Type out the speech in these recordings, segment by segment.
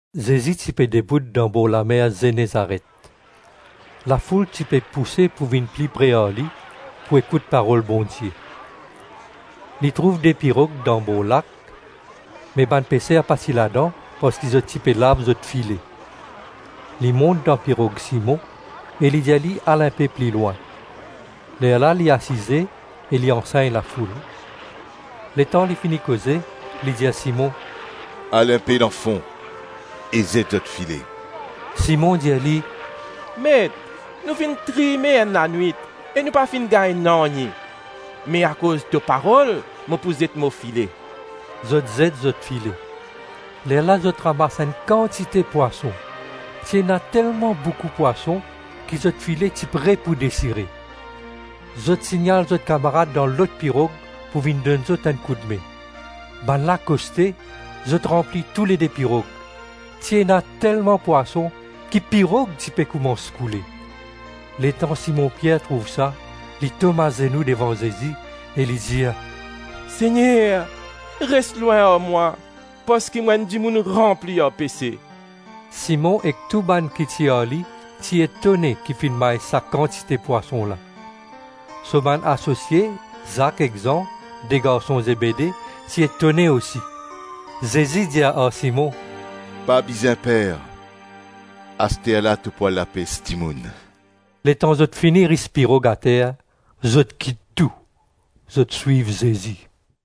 Zezi ti pe dibout danbor lamer Zenezaret. Lafoul ti pe pouse pou vinn pli pre ar li, pou ekout parol Bondie. Li trouv de pirog danbor lak, me bann peser pa ti ladan, parski zot ti pe lav zot file. Li mont dan pirog Simon, e li dir li al inpe pli lwin. Lerla li asize e li ansegn lafoul. Letan li fini koze, li dir Simon, “Al inpe dan fon e zet zot file.” Simon dir li, “Met, nou finn trime enn lanwit e nou pa finn gagn nanye! Me akoz to parol mo pou zet mo file.” Zot zet zot file. Lerla zot ramas enn kantite pwason; ti ena telman boukou pwason ki zot file ti pre pou desire. Zot signal zot kamarad dan lot pirog pou vinn donn zot enn koudme. Bannla koste, zot ranpli toulede pirog. Ti ena telman pwason, ki pirog ti pe koumans koule. Letan Simon Pier trouv sa, li tom azenou devan Zezi e li dir, “Segner, res lwin ar mwa, parski mo enn dimoun ranpli ar pese.” Simon ek tou bann ki ti ar li, ti etone ki finn may sa kantite pwason la. So bann asosie Zak ek Zan, de garson Zebede ti etone osi. Zezi dir ar Simon, “Pa bizin per. Asterla to pou al lapes dimoun.” Letan zot fini ris pirog ater, zot kit tou, zot swiv Zezi.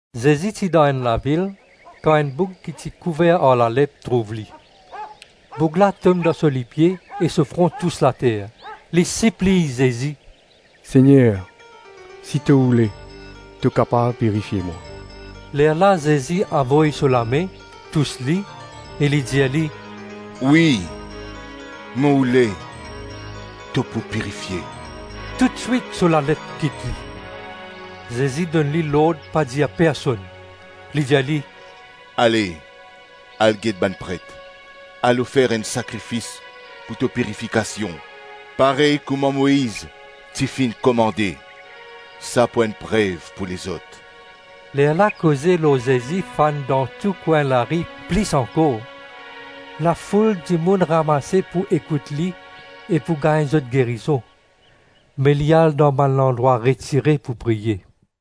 Zezi ti dan enn lavil, kan enn boug ki ti kouver ar lalep, trouv li. Boug la tom dan so lipie e so fron tous later. Li sipliy Zezi, “Segner, si to oule, to kapav pirifie mwa.” Lerla Zezi avoy so lame, tous li, e li dir li, “Wi, mo oule, to pou pirifie.” Toutswit so lalep kit li. Zezi donn li lord pa dir personn. Li dir li, “Ale, al get bann pret, al ofer enn sakrifis pou to pirifikasion, parey kouma Moiz ti finn komande. Sa pou enn prev pou lezot.” Lerla koze lor Zezi fann dan tou kwin lari plis ankor; lafoul dimoun ramase pou ekout li e pou gagn zot gerizon. Me li al dan bann landrwa retire pou priye.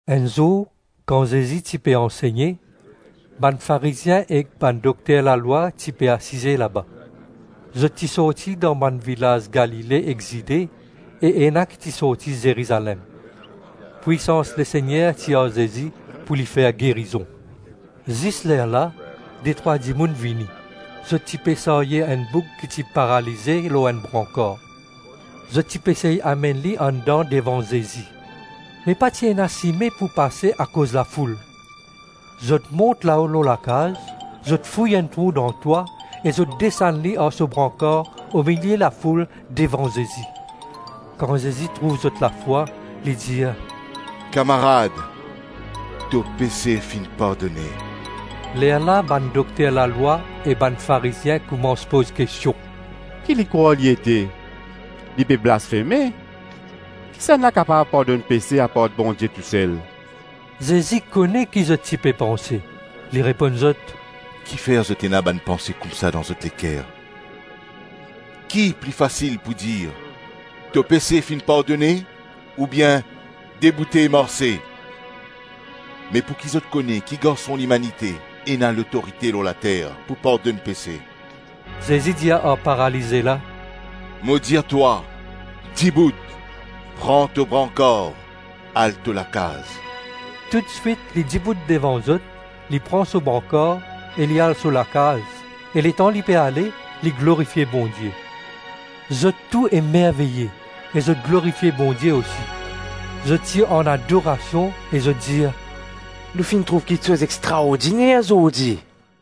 Enn zour, kan Zezi ti pe ansegne, bann Farizien ek bann dokter lalwa ti pe asize laba. Zot ti sorti dan bann vilaz Galile ek Zide e ena ki ti sorti Zerizalem. Pwisans Lesegner ti ar Zezi pou li fer gerizon. Zis lerla detrwa dimoun vini, zot ti pe sarye enn boug ki ti paralize lor enn brankar. Zot ti pe sey amenn li andan devan Zezi. Me pa ti ena sime pou pase akoz lafoul. Zot mont lao lor lakaz, zot fouy enn trou dan twa e zot desann li ar so brankar omilie lafoul devan Zezi. Kan Zezi trouv zot lafwa, li dir, “Kamarad, to pese finn pardone.” Lerla bann dokter lalwa e bann Farizien koumans poz kestion, “Ki li krwar li ete? Li pe blasfeme. Kisannla kapav pardonn pese apar Bondie tousel?” Zezi kone ki zot ti pe panse, li reponn zot, “Kifer zot ena bann panse koumsa dan zot leker? Ki pli fasil pou dir, ‘To pese finn pardone,’ oubien, ‘Deboute marse’? Me pouki zot kone ki Garson Limanite ena lotorite lor later pou pardonn pese” Zezi dir ar paralize la, “Mo dir twa, dibout, pran to brankar, al to lakaz.” Toutswit li dibout devan zot, li pran so brankar e li al so lakaz e letan li pe ale, li glorifie Bondie. Zot tou emerveye, e zot glorifie Bondie osi, zot ti an adorasion e zot dir, “Nou finn trouv kiksoz extraordiner zordi!”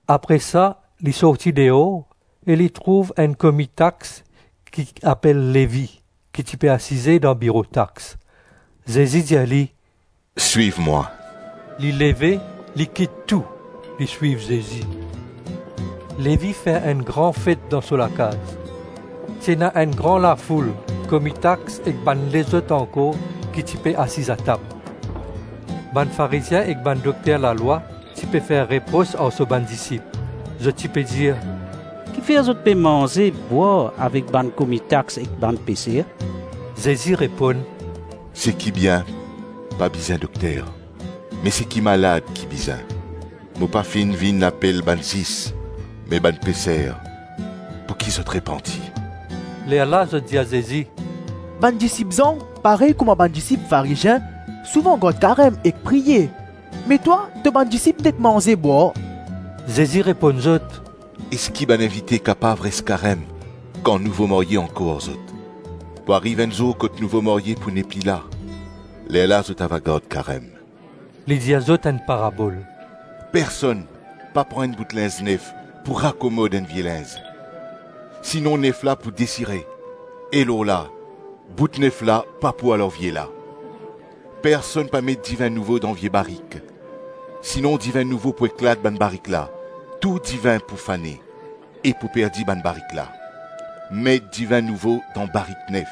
Apre sa li sorti deor e li trouv enn komi tax ki apel Levi, ki ti pe asiz dan biro tax; Zezi dir li, “Swiv mwa.” Li leve, li kit tou, li swiv Zezi. Levi fer enn gran fet dan so lakaz; ti ena enn gran lafoul komi tax ek bann lezot ankor ki ti pe asiz atab. Bann Farizien ek bann dokter lalwa ti pe fer repros ar so bann disip. Zot ti pe dir, “Kifer zot pe manze-bwar avek bann komi tax ek bann peser?” Zezi reponn, “Seki bien pa bizin dokter, me seki malad ki bizin; mo pa finn vinn apel bann zis me bann peser pouki zot repanti.” Lerla zot dir Zezi, “Bann disip Zan parey kouma bann disip Farizien, souvan gard karem ek priye, me twa to bann disip nek manze-bwar.” Zezi reponn zot, “Eski bann invite kapav res karem kan nouvo marye ankor ar zot? Pou ariv enn zour kot nouvo marye pou nepli la, lerla zot ava gard karem.” Li dir zot enn parabol, “Personn pa pran enn bout linz nef pou rakomod enn vie linz. Sinon nef la pou desire e lorla, bout nef la pa pou al ar vie la. Personn pa met divin nouvo dan vie barik; sinon divin nouvo pou eklat bann barik la, tou divin pou fane, e pou perdi bann barik la. Met divin nouvo dan barik nef.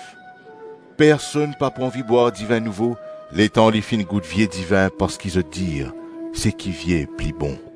Personn pa pou anvi bwar divin nouvo, letan li finn gout vie divin parski zot dir, ‘Seki vie pli bon.’”